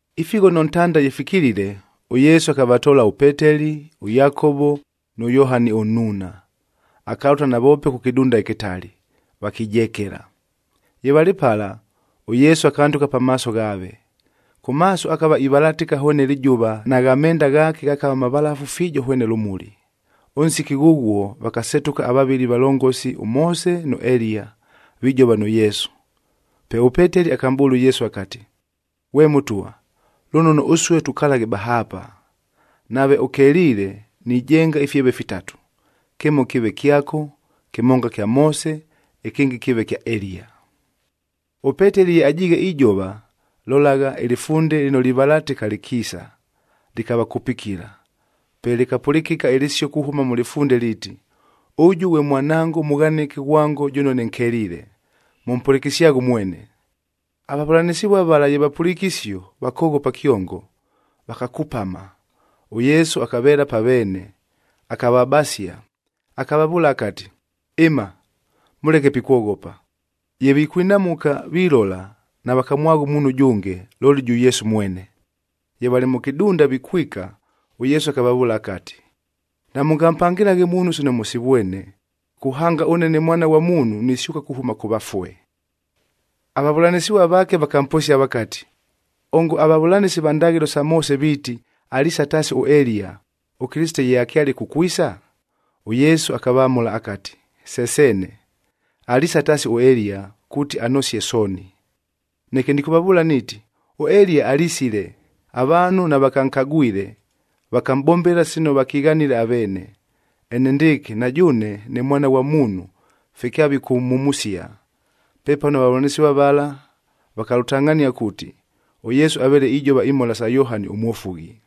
Ifighono ntanda ye fikilile, ʉYesu akavatoola ʉPeteli, ʉYakovo nʉ Yohani ʉnnuuna. Akalʉta navoope kʉ kɨdunda ɨkɨtali, vakijekela. Ye valɨ pala, ʉYesu akandʉka pamaaso ghaave. Kʉ maaso akava ivalatɨka hwene lɨjʉva nagha menda ghaake ghakava mavalafu fiijo hwene lʉmuli. Ʉnsiki ghʉghuo, vakasetʉka avavɨli avalongosi ʉMoose nʉ Eliya, vijova nʉ Yesu. Pe ʉPeteli akamʼbʉʉla ʉYesu akati, “Ghwe Mʉtwa, lʉnono ʉsue tukalaghe bahaapa! Nave ʉkeliile, nijenga ifyeve fitatu. Kɨmo kɨɨve kyako, kɨmonga kya Moose, ɨkɨngɨ kɨɨve kya Eliya.” ɄPeteli ye ajiighe ijova, lolagha, ɨlɨfunde lɨno livalatɨka lɨkiisa, lɨkavakupikila. Pe lɨkapʉlɨkɨka ɨlɨsio kuhʉma mʉ lɨfunde liiti, “Ʉjʉ ghwe Mwanango ʉmʉghanɨke ghwango jʉno nɨnkeliile, mʉmpʉlɨkɨsyaghe ʉmwene!” Avavʉlanɨsɨvua vala ye vapʉliike isio, vakoghopa kyongo, vakakupama. ɄYesu akaveela pa veene, akavabasia, akavavʉʉla akati, “Ɨma, mʉleke pikwoghopa!” Ye vikwinamʉka, vilola, navakamwagha ʉmuunhu ʉjʉnge, looli jʉ Yesu mwene. Ye valɨ mʉ kɨdunda vikwika, ʉYesu akavavʉʉla akati, “Namʉngampangɨlaghe muunhu sino mʉsivwene, kuhanga ʉnsiki ghʉno ʉne ne Mwana ghwa Muunhu nisyʉka kuhʉma kʉ vafue.” Avavʉlanɨsɨvua vaake vakamposia vakati, “Ongo avavʉlanɨsi va ndaghɨlo sa Moose viiti, aliisa taasi ʉEliya, ʉKɨlɨsite ye akyale kukwisa?” ɄYesu akavamʉla akati, “Se seene, aliisa taasi ʉEliya, kuuti anosie sooni. Neke nɨkʉvavʉʉla niiti, ʉEliya alisile, avaanhu navakankagwile, vakamʼbombela sino vakighanile aveene. Enendɨɨkɨ, na jʉʉne ne Mwana ghwa Muunhu fye kyavikʉmhumusia.” Pepano avavʉlanɨsɨvua vala vakalʉtangʼhania kuuti, ʉYesu aveele ijova imhola sa Yohani ʉMwofughi.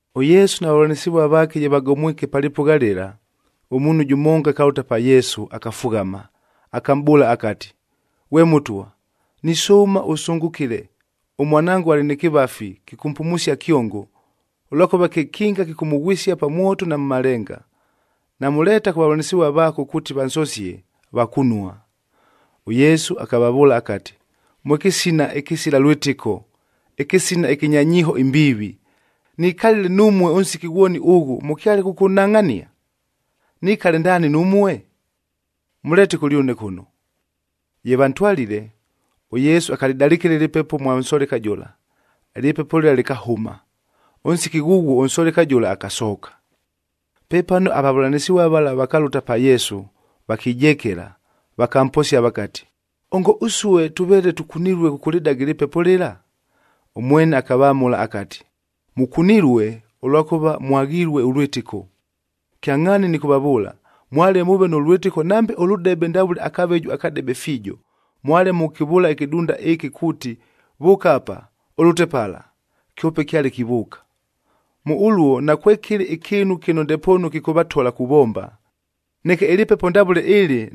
ɄYesu na vavʉlanɨsɨvua vaake ye vagomwike pa lɨpʉgha lɨla, ʉmuunhu jʉmonga akalʉta pa Yesu, akafughama, akamʼbʉʉla akati, “Ghwe Mʉtwa, nisʉʉma ʉsʉngʉkɨle, ʉmwanango alɨ nɨ kɨvafi, kɨkʉmpumusia kyongo, ʉlwakʉva kekinga kɨkʉmʉghwɨsia pa mwoto na mʉ malenga. Namʉleeta kʉ vavʉlanɨsɨvua vaako kuuti vansosie, vakunua.” ɄYesu akavavʉʉla akati, “Mwe kɨsina ɨkɨsila lwɨtɨko, ɨkɨsina ɨkɨnya nyiiho imbiivi! Nikalile numue ʉnsiki ghwoni ʉghʉ, mʉkyale kʉkʉnhangʼhania? Nikale ndaani numue? Mʉleete kʉlyʉne kʉno!” Ye vantwalile, ʉYesu akalɨdalɨkɨla ɨlɨpepo mwa nsoleka jʉla, ɨlɨpepo lɨla lɨkahʉma. Ʉnsiki ghʉghuo ʉnsoleka jʉla akasooka. Pepano avavʉlanɨsɨvua vala vakalʉta pa Yesu, vakijekela, vakamposia vakati, “Ongo ʉsue tʉveele tʉkunilue kʉkʉlɨdaga ɨlɨpepo lɨla?” Ʉmwene akavamʉla akati, “Mʉkunilue, ʉlwakʉva mwaghilue ʉlwɨtɨko! Kyangʼhaani nɨkʉvavʉʉla, mwale mʉʉve nʉ lwɨtɨko nambe ʉlʉdebe ndavʉle akaveju akadebe fiijo, mwale mʉkʉkɨvʉʉla ɨkɨdunda ɨkɨ kuuti, ‘Vʉʉka apa, ʉlʉte pala,’ kyope kyale kivʉʉka. Mʉ ʉluo nakwekɨlɨ ɨkɨɨnu kɨno ndepoonu kɨkʉvatola kuvomba. Neke ɨlɨpepo ndavʉle ɨlɨ,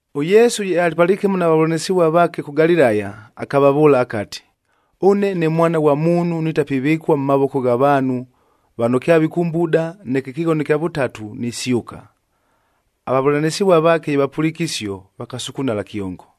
ɄYesu ye alɨ palɨkɨmo na vavʉlanɨsɨvua vaake kʉ Galilaya, akavavʉʉla akati, “Ʉne ne Mwana ghwa Muunhu nitapivɨkua mʉ mavoko gha vaanhu, vano kyavikʉmbuda, neke ɨkɨghono ɨkya vʉtatu, nisyʉka.” Avavʉlanɨsɨvua vaake ye vapʉliike isio, vakasukunala kyongo.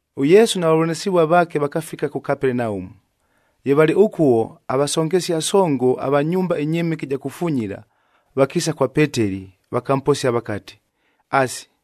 ɄYesu na vavʉlanɨsɨvua vaake vakafika kʉ Kapelenaumu. Ye valɨ ʉkuo, avasongesia songo ava nyumba ɨnyɨmɨke ɨja kufunyila, vakiisa kwa Peteli, vakamposia vakati, “Asi,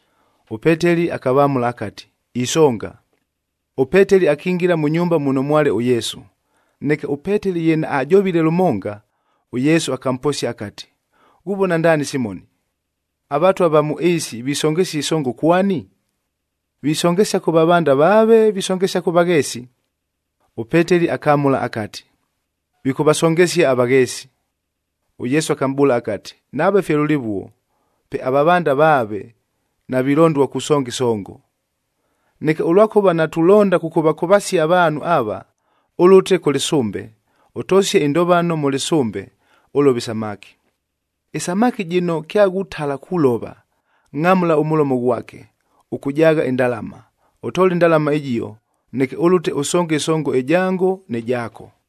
ɄPeteli akavamʉla akati, “Isonga.” ɄPeteli akingila mʉ nyumba muno mwale ʉYesu. Neke ʉPeteli ye naajovile lʉmonga, ʉYesu akamposia akati, “Ghuvona ndaani Simoni? Avatwa va mʉ ɨɨsi visongesia ɨsongo kwani? Visongesia kʉ vavanda vaave, visongesia kʉ vagheesi?” ɄPeteli akamʉla akati, “Vikʉvasongesia avagheesi.” ɄYesu akamʼbʉʉla akati, “Nave fye lʉlɨvuo, pe avavanda vaave navilondua kusonga ɨsongo. Neke ʉlwakʉva natulonda kʉkʉvakʉvasia avaanhu ava, ʉlʉte kʉ lɨsʉmbe, ʉtosie ɨndovano mʉ lɨsʉmbe, ʉlove isamaki. Ɨsamaki jɨno kyaghutala kulova, ngʼamʉla ʉmʉlomo ghwake, ʉkʉjaagha ɨndalama. Ʉtoole ɨndalama ɨjio, neke ʉlʉte ʉsonge ɨsongo ɨjango nɨ jaako.”